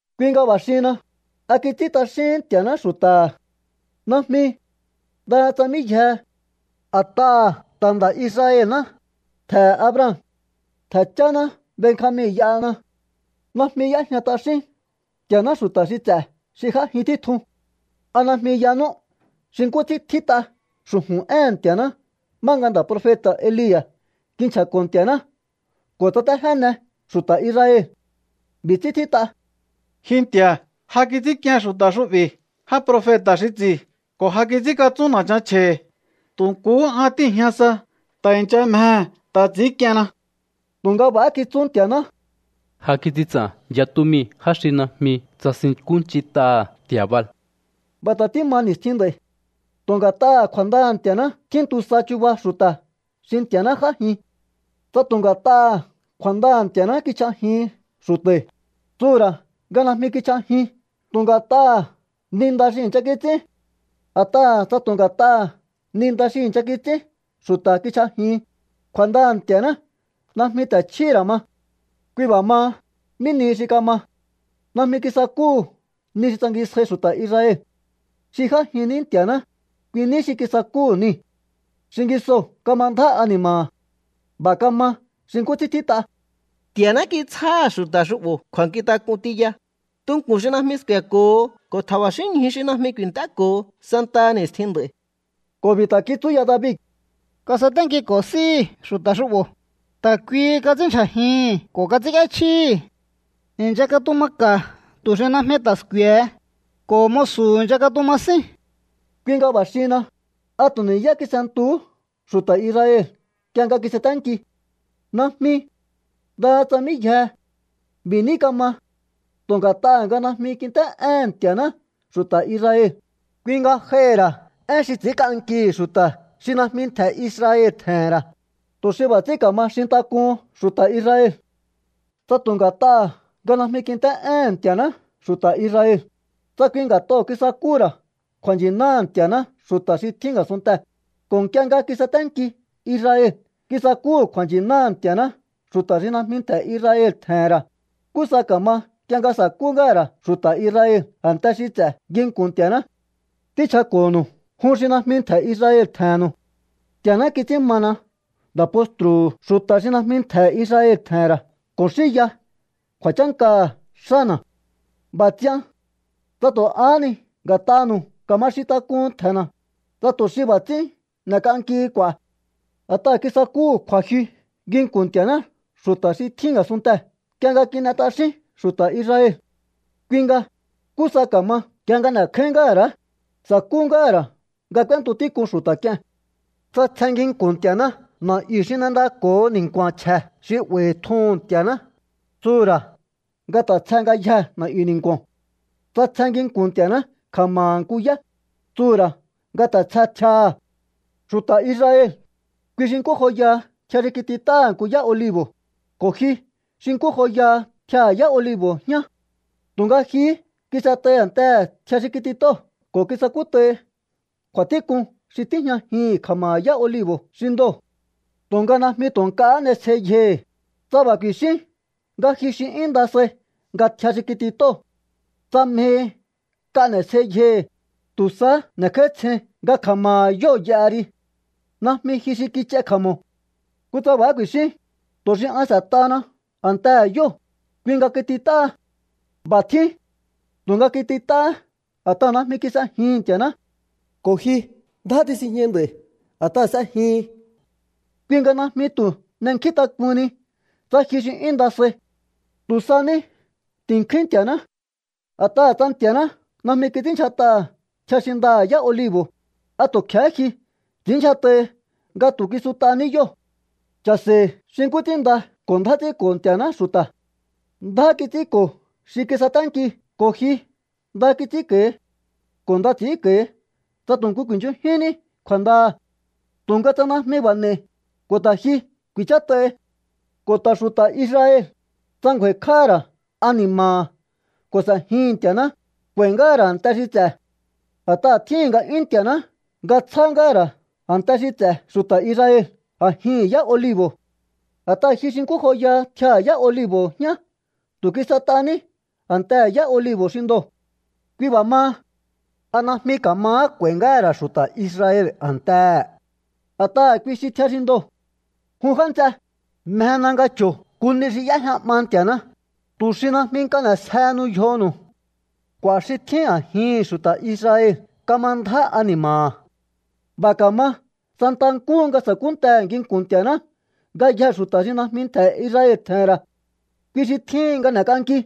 Kui nga b'a̱ xihinna, ¿a kits'ín t'axíhín Nti̱a̱ná xu̱ta̱ha̱? ¡Najmi! ¡Ndaha tsa mí yjehe! A̱t'aha̱ ta̱ nda̱ Israel ná, ntje̱he̱ Abraham. Ntje̱ cháná Benjamin y'ahana. Najmi y'éjña t'axín Nti̱a̱ná xu̱ta̱ xi ts'e̱ xi j'ájin títjun. ¿A najmi yanú xi nkú ts'ín tjít'a xu̱ju̱n éhe̱n Nti̱a̱ná má nga nda̱ profeta̱ Elia̱ kinchja̱ko̱ Nti̱a̱ná ko̱ tsatéjéne xu̱ta̱ Israel? B'i̱ ts'ín tjít'a: “Ji Nti̱a̱, ja kits'ínk'ien xu̱ta̱ xu'bi̱ já profeta̱ xi ts'i̱ ko̱ ja kits'ínkatsún na̱chan chje̱hi̱. Tu̱ nkuhú an tíi̱jña sa. Ta̱ i̱ncha mjehe̱ ta̱ ts'i̱ínk'ienna.” Tu̱nga b'a̱há kitsú Nti̱a̱ná: “Ja kits'in ts'a̱n yatu mii̱ já xi najmi tsasinkúnch'int'aha̱ nti̱a̱ Baal.” B'a̱ ta̱ tíma ni̱stjin nd'a̱i̱. Tu̱ nga̱t'aha̱ kju̱a̱ndaha̱ Nti̱a̱ná tjíntu sa chuba xu̱ta̱ xi Nti̱a̱ná j'ájin. Tsa tu̱ nga̱t'aha̱ kju̱a̱ndaha̱ Nti̱a̱ná kichj'ajihin xu̱ta̱i̱, tsuhu̱ ra̱ nga najmi kichj'ajin tu̱ nga̱t'aha̱ ni nda xi i̱ncha kits'ín. A̱t'aha̱ tsa tu̱ nga̱t'aha̱ ni nda xi i̱ncha kits'ín xu̱ta̱ kichj'ajihin, kju̱a̱ndaha̱ Nti̱a̱ná najmi ta̱ chjíhi̱ ra̱ ma. Kui b'a̱ maha, ¿mí nihi xi kama? Najmi kisakúhu̱ ni xi tsangisjáí xu̱ta̱ Israel. Xi j'ájin ní Nti̱a̱ná, kui ní xi kisakúhu̱ niu̱. Xingisoo̱ kama ndjá ani̱ma̱ha̱. B'a̱ kama xi nkú ts'ín tjít'a: “Nti̱a̱ná kitsjáha̱ xu̱ta̱ xu'bo̱ kju̱a̱nkjintak'un tiya, tunku̱n xi najmi sku̱e̱ko̱ho ko̱ tja̱ba̱xínñju xi najmi ku̱i̱nt'éko̱ho santaha ni̱stjin nd'a̱i̱.” Ko̱ b'i̱ ta̱ kitsú ya David: Kasaténkiko̱ s'íhi̱ xu̱ta̱ xu'bo̱, ta̱ kuihi kats'ínndyjajihi̱n ko̱ kats'ínk'íéchjíhi̱. I̱ncha katuma ka̱ tu̱ xi najmi ta̱ sku̱e̱he, ko̱ musu̱ i̱ncha katuma sín. Kui nga b'a̱ xihinna, ¿a tu̱ ni̱yá kis'entuhú xu̱ta̱ Israel nk'ie nga kisaténki? ¡Najmi! ¡Ndaha tsa mí yjehe! B'i̱ ní kama. Tu̱ nga̱t'aha̱ nga najmi kint'é'éhe̱n Nti̱a̱ná xu̱ta̱ Israel, kui nga j'aihi̱ ra̱ én xi ts'i̱ínk'ankihi̱ xu̱ta̱ xi najmi ntje̱ Israel tje̱he̱n ra̱, tu̱ xi b'a̱ ts'ín ka̱ma xintak'uhun xu̱ta̱ Israel. Tsa tu̱ nga̱t'aha̱ nga najmi kint'é'éhen Nti̱a̱ná xu̱ta̱ Israel, tsa kui nga̱t'oo̱ kisakúhu̱ ra̱ kju̱a̱nchi̱náha̱ Nti̱a̱ná xu̱ta̱ xi tjín a̱sunntee̱, ko̱ nk'ie nga kisaténki Israel kisakúhu̱ kju̱a̱nchi̱náha̱ Nti̱a̱ná xu̱ta̱ xi najmi ntje̱ Israel tje̱he̱n ra̱, ¿nkú sa ka̱ma nk'ie nga sa̱kú ngáha̱ ra̱ xu̱ta̱ Israel a̱nte xi ts'e̱ nginku̱n Nti̱a̱ná? Tínchjako̱nu̱u jun xi najmi ntje̱ Israel tje̱he̱nnu̱u. Nti̱a̱ná kits'ín mana nda̱ postru̱hu̱ xu̱ta̱ xi najmi ntje̱ Israel tje̱he̱n ra̱ ko̱ xinya kju̱a̱chánkaha̱ xána̱. B'a̱ ts'ian tsa tu̱ ahá ni nga̱t'anu̱u ka̱ma xintak'uhun ntje̱na̱, tsa tu̱ xi b'a̱ ts'ín n'e̱k'ankihi k'u̱a̱. A̱t'aha̱ kisakúhu̱ kju̱a̱jyu nginku̱n Nti̱a̱ná xu̱ta̱ xi tjín a̱sunntee̱ nk'ie nga kin'e t'axín xu̱ta̱ Israel. Kui nga, ¿nkú sa ka̱ma nk'ie nga n'e̱kjáín ngáha̱ ra̱? Sa̱kú ngáha̱ ra̱ nga k'úéntu tík'un xu̱ta̱ k'ie̱n. Tsa tsje nginku̱n Nti̱a̱ná na̱'yu̱ xi n'endako̱ho ni̱nku̱a̱n chje̱ xi 'ba̱i̱ tjuhu̱n Nti̱a̱ná, tsuhu̱ ra̱ nga ta̱ tsje ngayjee̱ na̱'yu̱ ni̱nku̱o̱n. Tsa tsje nginku̱n Nti̱a̱ná kja̱ma̱ha̱ nku yá, tsuhu̱ ra̱ nga ta̱ tsje tjiaha̱. Xu̱ta̱ Israel, kui xi nkú joyaha tjia xi kitit'áha̱ nku yá olibo̱, ko̱ ji xi nkú joyaha tjiaha̱ yá olibo̱ jñá. Tu̱nga jihí kis'et'ai a̱ntehe̱ tjia xi kitit'óo̱ ko̱ kisakút'aihi kju̱a̱tík'un xi tíjñajin kja̱ma̱ha̱ yá olibo̱ xi ndoo̱. Tu̱nga najmi tu̱ nk'ahá n'esjei yjohi̱, tsa b'a̱ ku̱i̱xín nga ji xi 'yún nda sai nga tjia xi kitit'óo̱. Tsa mjehi nk'a n'e̱sjei yjohi̱, tu̱ sahá n'e̱kj'áítsjein nga kja̱ma̱ha̱ yóo̱ y'aha ri. Najmi ji xi kich'ai kja̱mo̱. Kutsa b'a̱há ku̱i̱xín: “Tu̱ xi an s'e̱t'ahana a̱ntehe̱ yóo̱, kui nga kitit'áha.” B'a̱ tjín. Tu̱nga kitit'áhá a̱t'aha̱ najmi kis'ejihi̱n Nti̱a̱ná, ko̱ ji ndjá tisinjñai nd'a̱i̱ a̱t'aha̱ s'ejihin. Kui nga najmi tu̱ n'enkjíntak'uhunni tsa ji xi 'yún nda sai. Tu̱ sa ní ti̱nkjúín Nti̱a̱ná. A̱t'aha̱ tsa Nti̱a̱ná najmi kits'ínndyjat'aha̱ tjia xi ndaha̱ yá olibo̱, ¿a tu̱ kje̱hé ji ts'i̱ínndyjat'ahi nga tu̱ kisut'aní yóo̱? Cha̱se̱i̱ xi nkú ts'ín nda ko̱ ndjá ts'ínko̱ Nti̱a̱ná xu̱ta̱. Ndjá kits'ínko̱ xi kisaténki ko̱ ji nda kits'ínko̱hi. Ko̱ nda ts'i̱ínko̱hi tsa tu̱ nku ku̱i̱nchunjínní kju̱a̱ndaha̱. Tu̱nga tsa najmi b'a̱ n'e̱i̱, ko̱ ta̱ ji ku̱i̱chát'ahi. Ko̱ ta̱ xu̱ta̱ Israel, tsa ngju̱a̱i̱kj'áha̱ ra̱ ani̱ma̱ha̱ ko̱ s'e̱jihi̱n Nti̱a̱ná, k'u̱a̱i̱ ngáha̱ ra̱ a̱nte xi ts'e̱. A̱t'aha̱ tjíhi̱n nga'yún Nti̱a̱ná nga tsjá ngáha̱ ra̱ a̱nte xi ts'e̱ xu̱ta̱ Israel a̱jihi̱n yá olibo̱. A̱t'aha̱ ji xi nkú joyaha tjiaha̱ yá olibo̱ jñá tu̱ kis'et'aní a̱ntehe̱ yá olibo̱ xi ndoo̱. Kui b'a̱ maha, ¿a najmi ka̱mahá k'u̱a̱i̱ ngáha̱ ra̱ xu̱ta̱ Israel a̱ntehe̱? A̱t'aha̱ kui xi tjia xi ndoo̱. Jun já nts'e, mjena nga cho̱o nku ni xi y'éjña 'ma Nti̱a̱ná, tu̱ xi najmi nk'a n'e̱sjehenu yjonu̱u. K'u̱a̱ xi tjín a̱jihi̱n xu̱ta̱ Israel kama ndjá ani̱ma̱ha̱. B'a̱ ka̱ma santa nkúhu nga sa̱kúntehe̱ nginku̱n Nti̱a̱ná ngayjee̱ xu̱ta̱ xi najmi ntje̱ Israel tje̱he̱n ra̱. Kui xi tjíhin nga n'e̱k'anki.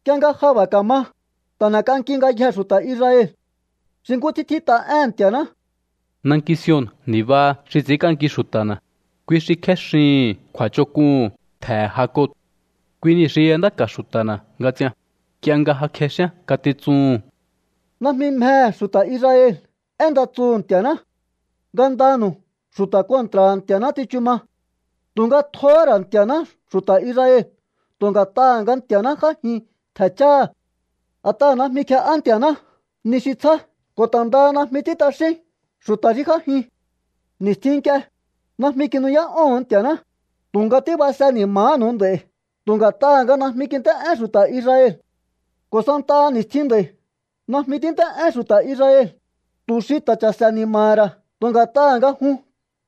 Nk'ie nga ja b'a̱ ka̱ma, ta̱ n'e̱k'anki ngayjee̱ xu̱ta̱ Israel. Xi nkú ts'ín tjít'a éhe̱n Nti̱a̱ná: Nanki Sion ni̱baha xi ts'i̱ínk'anki xu̱ta̱na̱, kui xi kjéxihi̱n kju̱a̱ch'onk'uhu̱n ntje̱he̱ Jacob. Kui nii̱ xi y'endáka̱ xu̱ta̱na̱ nga ts'ian, nk'ie nga ja kjexíán ngatitsuhu̱n. Najmi mjehe̱ xu̱ta̱ Israel én nda tsuhu̱ Nti̱a̱ná. Ngandanu̱u xu̱ta̱ kontra̱ha̱ Nti̱a̱ná tsichu ma. Tu̱nga tjohó ra̱ Nti̱a̱ná xu̱ta̱ Israel tu̱ nga̱t'aha̱ nga Nti̱a̱ná j'ájin ntje̱ cháha̱. A̱t'aha̱ najmi kje'á Nti̱a̱ná ni xi tsjá ko̱ ta̱ ndaha najmi ts'ín t'axín xu̱ta̱ xi j'ájin. Ni̱stjin nk'ie, najmi kinu'yá'óho̱on Nti̱a̱ná, tu̱nga tíbase ni̱ma̱hánu̱u nd'a̱i̱ tu̱ nga̱t'aha̱ nga najmi kint'é'én xu̱ta̱ Israel. Ko̱ santaha ni̱stjin nd'a̱i̱ najmi tínt'é'én xu̱ta̱ Israel, tu̱ xi ta̱ cha̱se̱ ni̱ma̱ha̱ ra̱ tu̱ nga̱t'aha̱ nga jun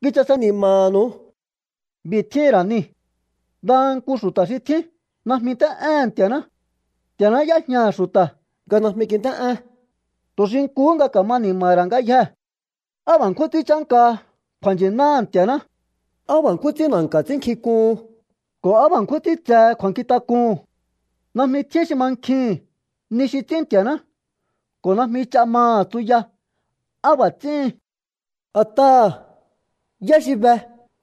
kichase ni̱ma̱nu̱u. B'i̱ tjíhi̱n ra̱ nii̱. Ndaha nku xu̱ta̱ xi tjín najmi nt'é'éhe̱n Nti̱a̱ná. Nti̱a̱ná y'éjñaha̱ xu̱ta̱ nga najmi kint'é'én, tu̱ xi nkuhú nga ka̱ma ni̱ma̱ha̱ ra̱ ngayjee̱. ¡Á b'a̱ nkjún ts'ín chánkaha kju̱a̱nchi̱náha̱ Nti̱a̱ná! ¡Á b'a̱ nkjún ts'ín na̱nka̱ ts'ínnkjink'uhun ko̱ á b'a̱ nkjún ts'ín tsehe kju̱a̱nkjintak'uhu̱n! Najmi tjín xi mankjihi̱n ni xi ts'ín Nti̱a̱ná ko̱ najmi ch'a maha̱ tsuya á b'a̱ ts'íhin. A̱t'aha̱, ¿yá xi be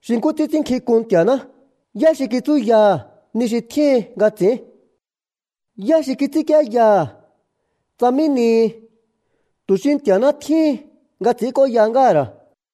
xi nkú ts'ín ts'ínnkjink'un Nti̱a̱ná? ¿Yá xi kitsúyaha̱ ni xi tjíhin nga ts'i̱ín? ¿Yá xi kits'ínkienyaha̱ tsa mí nihi, tu̱ xi Nti̱a̱ná tjíhin nga ts'i̱ínk'óya ngáha̱ ra̱?